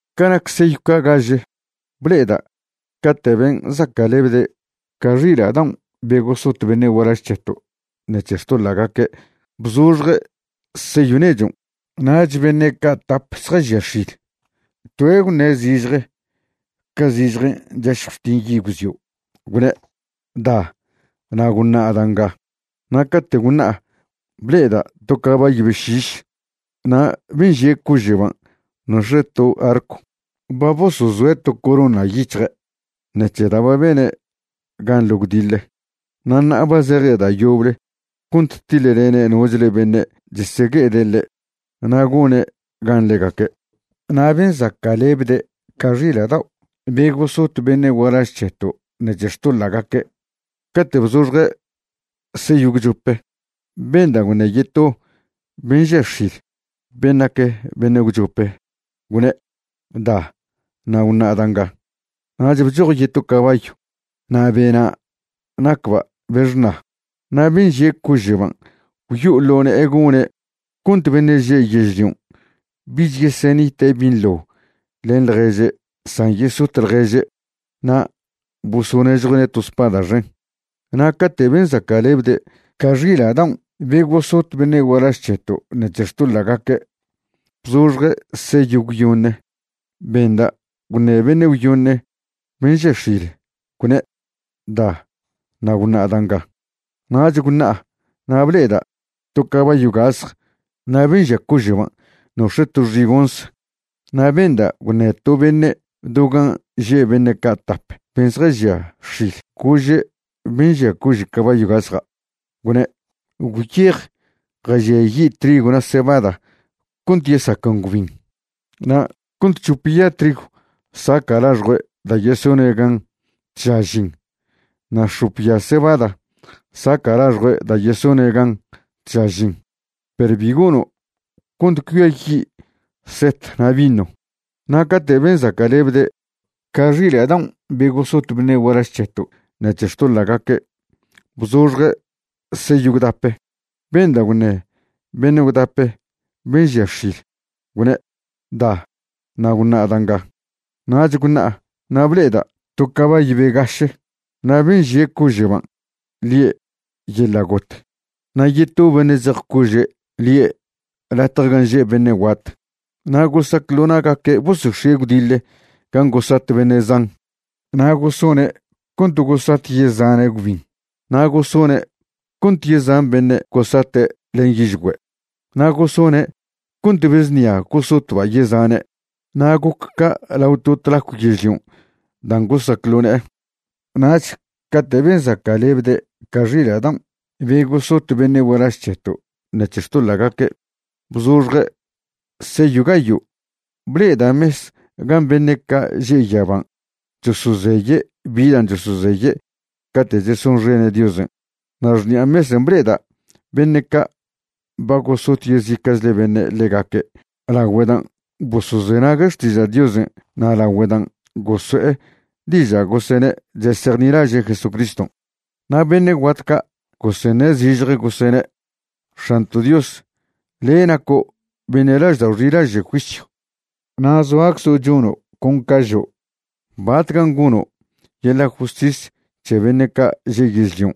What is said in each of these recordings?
Ca nac seyw ca' gaže, ble'eda' cate' ben' zaca'lebde' ca xila' daon' be gosot beṉe' gualaž c̱heto' ṉec̱he xtoḻa'gaque' bzoxje' seyw nechon'. Nach beṉe' ca' tap zjažia x̱il, toe' gwṉe' zižje, ca zižjen' chašjw chtin yi' gwzio', gwne': ―Da, na' gwṉa' da' nga. Na' cate' gwṉa'a, ble'eda' to cabayw be šiš na' ben' žie' cože'ban' nox̱e' to arcw. Ba bosozoe' to corona yic̱hje' ṉec̱he da' ba bene' gan ḻo gwdiḻe, na' ṉa'a ba zeje' da' yoble cont tiḻlene' nochle beṉe' chesegue'ede' ḻe' na' gone' gan ḻegaque'. Na' ben' zaca'lebde' ca xila' dao' be gosot beṉe' gualaž c̱heto' ṉec̱he xtoḻa'gaque', cate' bzoxje' seyw gwchope benda' gwṉe yeto ben' žia x̱il, ben' nac beṉe' gwchope, gwne': ―Da, na' gwṉa' da' nga. Nach bchoj yeto cabayw, na' bena' nacba' be xṉa. Na' ben' žie' cože'ban' gwyo'o ḻo ne'e gone' cont beṉe' že' yežlion' bich yesenite' binḻo len ḻježe' san yesot ḻježe'. Na' bosonežjue'ne' to spada xen. Na' cate' ben' zaca'lebde' ca xila' daon' be gosot beṉe' gualaž c̱heto' ṉec̱he xtoḻa'gaque' bzoxje' seyw gwyoṉe, benda' gwṉe beṉe' gwyoṉe ben' žia x̱il, gwne': ―Da, na' gwṉa' da' nga. Nach gwṉa'a na' ble'eda' to cabayw gasj na' ben' žie' cože'ban' nox̱e' to xigonz. Na' benda' gwṉe to beṉe' do gan' že' beṉe' ca' tap ben' zjažia x̱il, gože' ben' žia cože' cabayw gasja', gwne': ―Gwyej jažiayi' trigw na' cebada cont yesaquen gwbin na' cont c̱hop ya trigw saca' laxjue' da' yesone' gan tža žin na' x̱op ya cebada saca' laxjue' da' yesone' gan tža žin, perw bi gono' cont cuiayi' set na' vino. Na' cate' ben' zaca'lebde' ca xila' daon' be gosot beṉe' gualaž c̱heto' ṉec̱he xtoḻa'gaque' bzoxje' seyw gwdape, benda' gwṉe beṉe' gwdape ben' žia x̱il, gwne': ―Da, na' gwṉa' da' nga. Nach gwṉa'a na' ble'eda' to cabayw be gaše, na' ben' žie' cože'ban' lie' Yeḻa' Got. Na' yeto beṉe' zej cože', lie' Latje Gan' Že' Beṉe' Guat. Na' gosac ḻo na'gaque' bosox̱ie' gwdiḻe gan' gosat beṉe' zan, na' gosone' cont gosat yezane' gwbin, na' gosone' cont yezan beṉe' gosate' len yižgüe', na' gosone' cont be znia gosotba' yezane', na' goc ca' lao to tlacw yežlion' dan' gosac ḻo ne'e. Nach cate' ben' zaca'lebde' ca xila' daon' be gosot beṉe' gualaž c̱heto' ṉec̱he xtoḻa'gaque' bzoxje' seyw gayo', ble'eda' mes gan' beṉe' ca' že' yaban' chosozeye' bi dan' chosozeye' cate' chesonxene' Diosen', na' xṉi'a mesen' ble'eda' beṉe' ca' ba gosot yezica'chle beṉe' ḻegaque' lagüe dan' bosozenague' xtiža' Diosen' na' lagüe dan' goso'e diža' gosene' chesejnilaže' Jesucriston'. Na' beṉe' guat ca' goseṉe' zižje gosene': ―X̱anto' Dios, le' naco' beṉe' laždao' xilaže' juisyw na' zoaczo' chono' con ca žo'. ¿Batcan' gono' yeḻa' justis c̱he beṉe' ca' že' yežlion'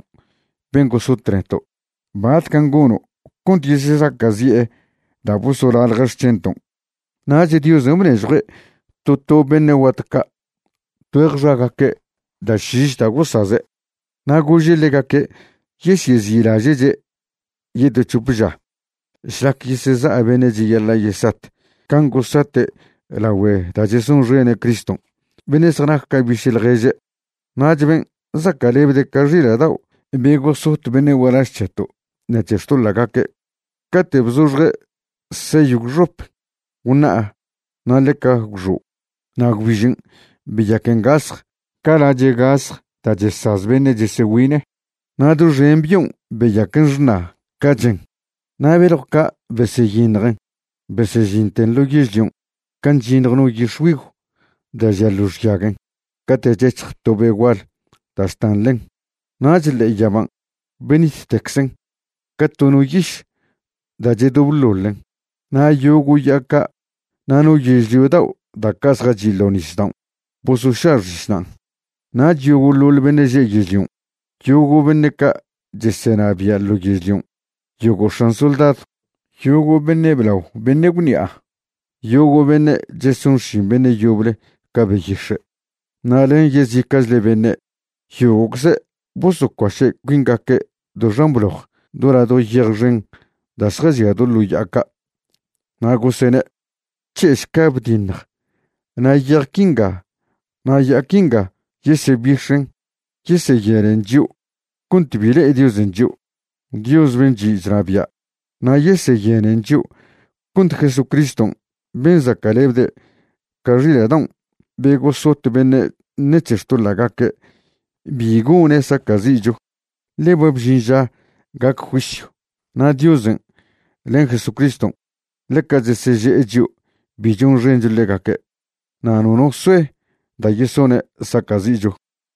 ben' gosot neto'? ¿Batcan' gono' cont yesezaca'zi'e da' bosolalje' xc̱henton'? Nach Diosen' bnežjue' to to beṉe' guat ca' tgüeje xagaque' da' šiš da' gosaze'. Na' gože' ḻegaque' yesyezi'laže'che' yeto c̱hop ža šlac yeseza' beṉe' cheyaḻa' yesat can' gosate' lagüe da' chesonxene' Criston', beṉe' zjanac ca biše' ḻježe'. Nach ben' zaca'lebde' ca xila' daon' be gosot beṉe' gualaž c̱heto' ṉec̱he xtoḻa'gaque', cate' bzoxje' seyw gwxope, gwṉa'a na' ḻeca gwxo'. Na' gwbižen' beyaquen gasj ca lache' gasj da' chesaz beṉe' chesegüine', na' doxen bion' beyaquen xṉa ca chen. Na' beljw ca' beseyiṉjen besežinten ḻo yežlion' can' chyiṉj no yix̱güigw da' žia ḻo xyaguen cate' chec̱hj to be' gual da' chtan ḻen. Nach ḻe'e yaban' benittecczen ca to no yiš da' chedobḻoḻen. Na' yogo' ya'a ca' na' no yežlio dao' da' ca' zjachi' ḻo' nisdaon' bosoša' xišnan'. Nach yogo'ḻoḻ beṉe' že' yežlion', yogo' beṉe' ca' chesenabia' ḻo yežlion', yogo' x̱an soldadw, yogo' beṉe' blao beṉe' gwṉi'a, yogo' beṉe' cheson xšin beṉe' yoble ca beyix̱e', na' len yezica'chle beṉe', yogo'cze' bosocuaše' cuingaque' do xan bloj, do ladjo yej xen da' zjažia ḻo ya'a ca'. Na' gosene': ―C̱he'šca bdiṉj na' yej quinga na' ya'a quinga yesebix̱en yeseyenen chio' cont bi le'e Diosen' chio', Dios ben' chi' chnabia', na' yeseyenen chio' cont Jesucriston' ben' zaca'lebde' ca xila' daon' be gosot beṉe' ṉec̱he xtoḻa'gaque' bi gone' saca'zi'cho. Ḻe ba bžin ža gac juisyw, na' Diosen' len Jesucriston' ḻeca cheseže'e chio' bi chonxencho ḻegaque', na' nono soe da' yesone' saca'zi'cho.